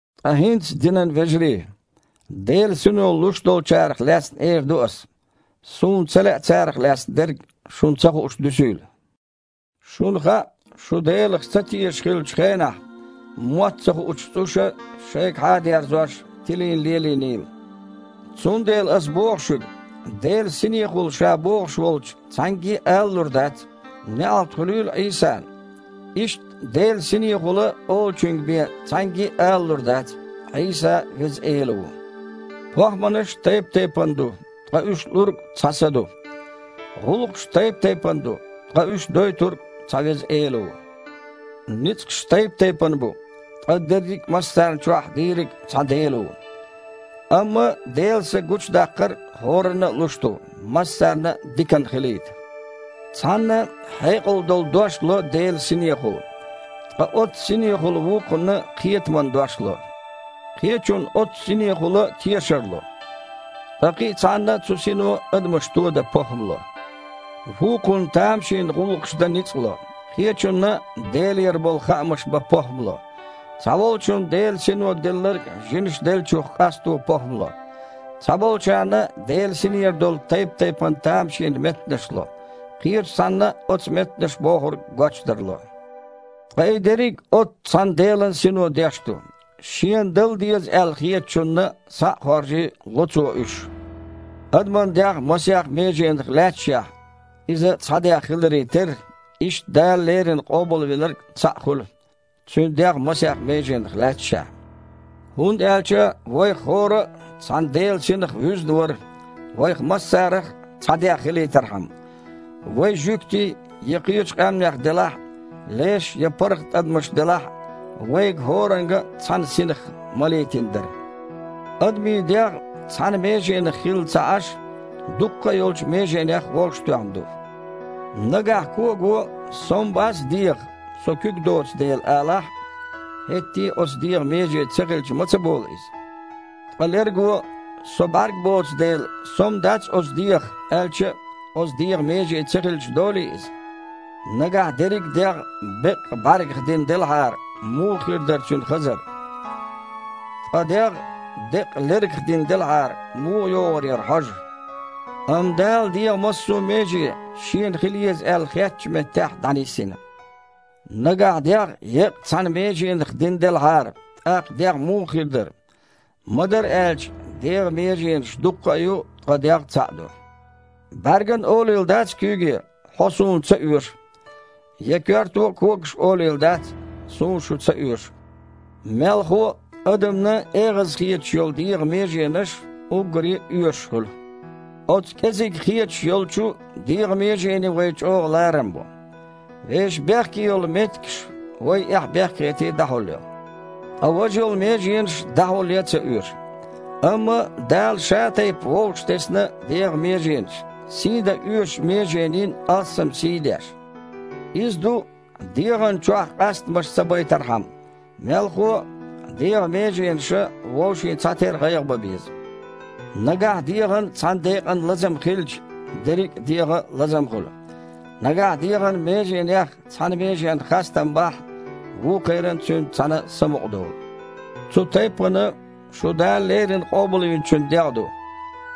Ткъа хІинца, динан вежарий, Делан Сино луш долчарах лаьцна эр ду ас. Суна ца лаьа, царах лаьцна дерг шуна ца хууш дуьсийла. Шуна хаьа, шу Делах ца тешаш хиллачу хенахь, мотт ца хуучу цІуша, шайгахьа а дерзош, тилийна лелийнийла. Цундела аса шуьга боху, Делан Синехула ша бохуш волчу цхьаьнгге а алалур дац: «НеІалт хуьлийла Іийсана». Иштта Делан Синехула олучуьнга бен, цхьаьнгге а алалур дац: «Іийса – Веза Эла ву». ПохІманаш тайп-тайпана ду, ткъа уьш лург – цхьа Са ду. ГІуллакхаш тайп-тайпана ду, ткъа уьш дойтург – цхьа Веза Эла ву. Ницкъаш тайп-тайпана бу, ткъа дерриг а массарна а чохь дийриг – цхьа Дела ву. Амма Делан Са гучудаккхар хІоранна а луш ду, массарна а диканна хилийта. Цхьанна хьекъал долу дош ло Делан Синехула, ткъа оццу Синехула вукхунна кхетаман дош ло. Кхечунна оццу Синехула тешар ло. Ткъа кхин а цхьанна цу Сино адамаш тодан похІма ло. Вукхунна тамашийна гІуллакхаш дан ницкъ ло. Кхечунна Делера болу хаамаш бан похІма ло. Цхьаволчунна Делан Сино делларг жинаша деллачух къасто похІма ло. Цхьаболчарна Делан Синера долу тайп-тайпана тамашийна меттанаш ло. Кхечу цхьанна оцу меттанаша бохург гочдар ло. Ткъа и дерриг а оццу цхьана Делан Сино деш ду. Шена дала деза аьлла хеттачунна, схьа а хоржий, ло Цо уьш. Адаман дегІ масех меженах лаьтташехь, иза цхьа дегІ хиларе терра, иштта Дала леррина Къобалвинарг цхьаъ хуьлу, Цуьнан дегІ масех меженах лаьтташехь. ХІунда аьлча вайх хІора а цхьана Делан Синах вуьзна вара, вайх массарах а цхьа дегІ хилийтархьама. Вай жуьгтий я кхечу къаьмнех делахь а, леш я паргІат адамаш делахь а, вайга хІоранга а цхьана Синах малийтина дара. Адамийн дегІ, цхьана меженах хилла а ца Іаш, дуккха а йолчу меженех вовшахтоьхна ду. Нагахь кого: «Со-м бац дегІах, со куьг доцу дела», – алахь а, хІетте а оцу дегІан меже ца хилча ма ца болу иза. Ткъа лерго: «Со бІаьрг боцу дела, со-м дац оцу дегІах», – аьлча а, оцу дегІан меже ца хилча долий иза? Нагахь дерриг а дегІ беккъа бІаьргех дина делахьара, муха хир дара цуьнан хазар? Ткъа дегІ деккъа лергех дина делахьара, муха йогІур яра хьожа? Амма Дала дегІан массо а меже Шена хила еза аьлла хеттачу меттехь дІанисйина. Нагахь дегІ еккъа цхьана меженах дина делахьара, тІаккха дегІ муха хир дара? Ма-дарра аьлча, дегІан меженаш дуккха а ю, ткъа дегІ – цхьаъ ду. БІаьрган а олийла дац куьйге: «Хьо суна ца оьшу». Я коьрто а когашка олийла дац: «Суна шу ца оьшу». Мелхо а, адамна эгІаза хеташ йолу дегІан меженаш уггаре а оьшуш хуьлу. Оцу кІезиг хеташ йолчу дегІан меженийн вай чІогІа ларам бо. Вешан бехке йолу меттигаш вай, эхь-бехк а хетий, дІахьулйо. Ткъа важа йолу меженаш дІахьулъян а ца оьшу. Амма Дала шатайпа вовшахтесна дегІан меженаш, сий дан оьшучу меженийн алссам сий а деш. Иза ду, дегІана чохь къастамаш ца байтархьама. Мелхо а, дегІан меженаша вовшийн цхьатерра гІайгІа бан беза. Нагахь дегІан цхьана декъан лазам хилча, дерриг а дегІан а лазам хуьлу. Нагахь дегІан меженех цхьана меженна хастам бахь, вукхеран а цуьнца цхьаьна самукъадолу. Цу тайппана, шу Дала леррина Къобалвинчун дегІ ду,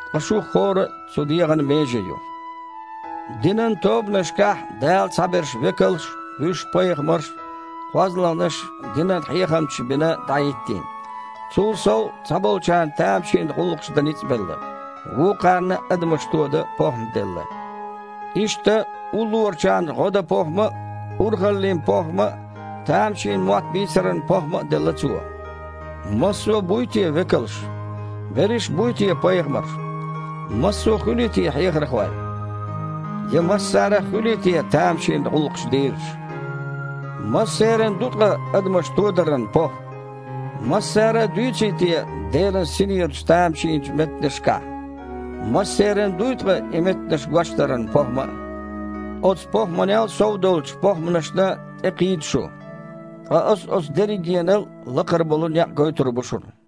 ткъа шух хІора а цу дегІан меже ю. Динан тобанашкахь Дала цхьаберш векалш, вуьш пайхамарш, кхозлагІнаш динан хьехамчаш бина дІахІиттийна. Цул сов, цхьаболчарна тамашийна гІуллакхаш дан ницкъ белла, вукхарна адамаш тодан похІма делла. Иштта уллорачарна гІо дан похІма а, урхаллин похІма а, тамашийна мотт бийцаран похІма а делла Цо. Массо а буй те векалш? Берриш а буй те пайхамарш? Массо а хуьлий те хьехархой? Я массарах а хуьлий те тамашийна гІуллакхаш дийраш? Массеран ду ткъа адамаш тодаран похІма? Массара а дуьйций те Делан Синерачу тамашийначу меттанашкахь? Массеран дуй ткъа и меттанаш гочдаран похІма а? Оцу похІманел а сов долчу похІманашна тІекхийда шу. Ткъа аса оцу дерригенал а лакхара болу некъ гойтур бу шуна.